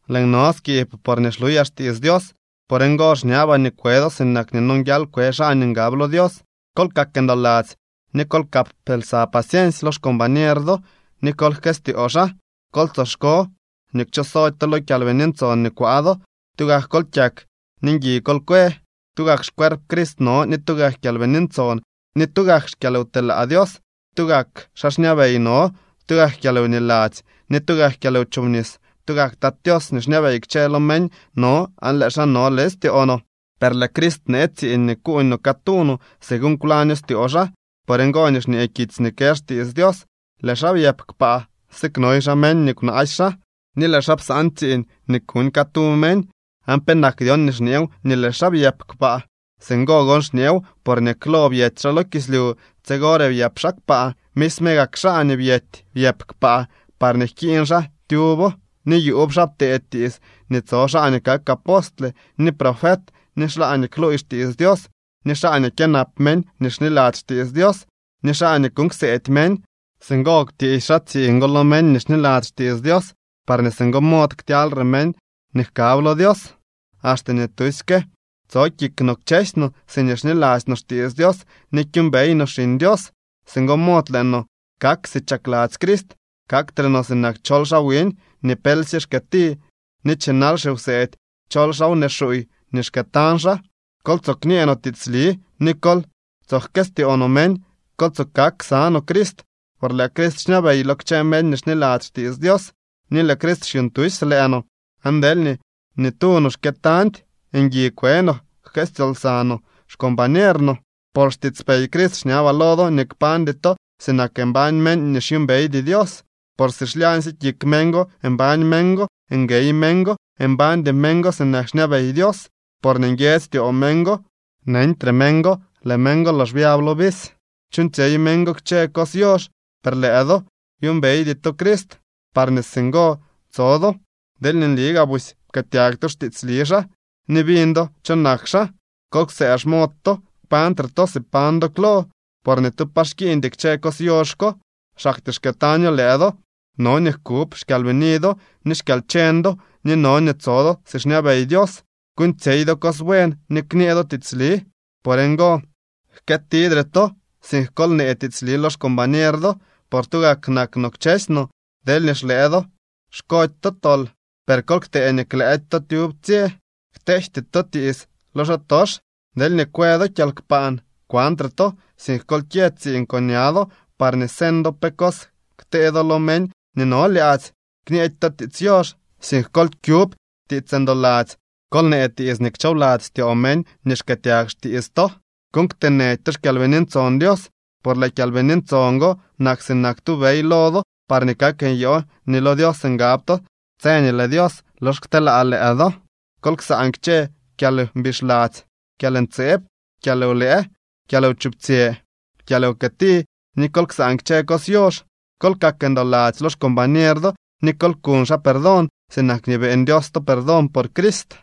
Lëën no skiib porñee xluyaa xtiits Dios. Por ngo xñabaa nii kwe do sinak nii nonguial kwe xaa nii ngab lo Dios. Kol kak ndoladzy ni kol kap lsa paciensy lo xcombañer do ni kol jkëstyoo xaa. Kol tsoxko nii kchooxsody to lo Kyalbini Ntson nii kwaa do. Tugak kol kyak ni ngui kol kwe. Tugak xcuerp Crist no ni tugak Kyalbini Ntson ni tugak xkyalwtelaa Dios. Tugak xaa xñabey no, tugak kyalwniladzy, ni tugak kyalwchobnis. Tugak Tat Tios nii xñabey kchë lo meñ no aan lëë xaa no leñ styoo no. Per lëë Crist bnee tsiiñ nii kuuñ no catu no, según kwlaño styoo xaa. Por ngo nii xñee kitsy nii kë xtiits Dios: Lëë xaa byëp kpaa, siknoy xaa meñ nii kwnaasy xaa, ni lëë xaa psaan tsiiñ nii kuñ catu meñ. ¿Aan penak dyon nii xñeew nii lëë xaa byëp kpaa? Singo gon xñeew porñee klo byety xaa lo kislyu, tsigore byëp xaa kpaa. Misme gak xaa nii byety byëp kpaa parñee jkiiñ xaa tyubo. Ni yuub xaa ptee tiits nii tso xaa nii kak apostle, ni profet, ni xaa nii kluuy xtiits Dios, ni xaa nii kyënap meñ nii xniladzy xtiits Dios, ni xaa nii kuuñ kseedy meñ. Singo kwtiisy xaa tsiiñ go lo meñ nii xniladzy xtiits Dios parñee singo mod ktyalyre meñ nii jkab lo Dios, axte nii tusyke tso kik no kchësy no siñee xniladzy no xtiits Dios ni kyuumbey no Xiñ Dios. Singo mod lëë no kak si chakladzy Crist. Kaktre no sinak chol xaa wiñ, nii pelsye xkyëti ni chinal xiwseedy chol xaa wnee xuuy nii xkëëtañ xaa. Kol tsoo kñee no tiitsli ni kol tso jkëstyoo no meñ. Kol tsoo kak ksa no Crist por lëë Crist xñabey lo kchë meñ nii xniladzy xtiits Dios. Ni lëë Crist xyuuñ tusy lëë no, aan deelñee ni tu no xkëëtañdy, ngui kwe no, jkëstyoo lsa no xcombañer no. Por xtiitspey Crist xñabaa lo do nii kpañdy to sinak mbañ meñ nii xyuumbeydy Dios, por si xlyaañtyee kik meñ go mbañ meñ go. Nguey meñ go. Mbañdy meñ go sinak xñabey Dios, porñee nguiedzy styoo meñ go. Neñtre meñ go, lëë meñ go lox byab lo visy. Chuuñtsyey meñ go kchë lo cos yox. Per lëë do byuumbeydy to Crist parñee singo tso do, deelñee nli gaa busy pkëëtyag to xtiitsli xaa, ni biñ do cho nak xaa. Kol ktsëë xmod to, kpañtre to si pañ do klo, por ni tu pa xkiiñdy kchë cos yox ko. Xaktyee xkëëtaño lëë do. No nii jkub xkyalbini do ni xkyalcheñ do, ni no nii tso do si xñabey Dios, kuuñtsyey do cos buen ni kñee do tiitsli. Por ngo, jkëëtidre to, sink kol nee tiitsli lo xcombañer do, por tugak nak no kchësy no. Deelñee xlëë do xkody to tol, per kol ktee nii klëëdy to tyub tsye. Kteejty to tiits lo xaatox. Deelñee kwë do kyalkpaan, kwantre to, sink kol kyë tsiiñ con ña do, parñee señ do pe cos ktee do lo meñ nii no lyaadzy. Kñeedy to tiits yox, sink kol kyub tiits ndoladzy. Kol nee tiits nii kchoobladzy styoo meñ nii xkëëtyag xtiits to. Kuuñ kteenëdy to xKyalbini Ntson Dios, por lëë Kyalbini Ntson go nak sinak tu bey lo do parñee kak nyoo nii lo Dios ngab to tse nii lëë Dios lox kteelaa lëë do. Kol ksaan kchë kyalmbixladzy, kyalntseeb, kyalwlëë, kyalwchuptsyë, kyalwkëti, ni kol ksaan kchë cos yox. Kol kak ndoladzy lo xcombañer do ni kol kuñ xaa perdón, sinak nii beeñ Dios to perdón por Crist.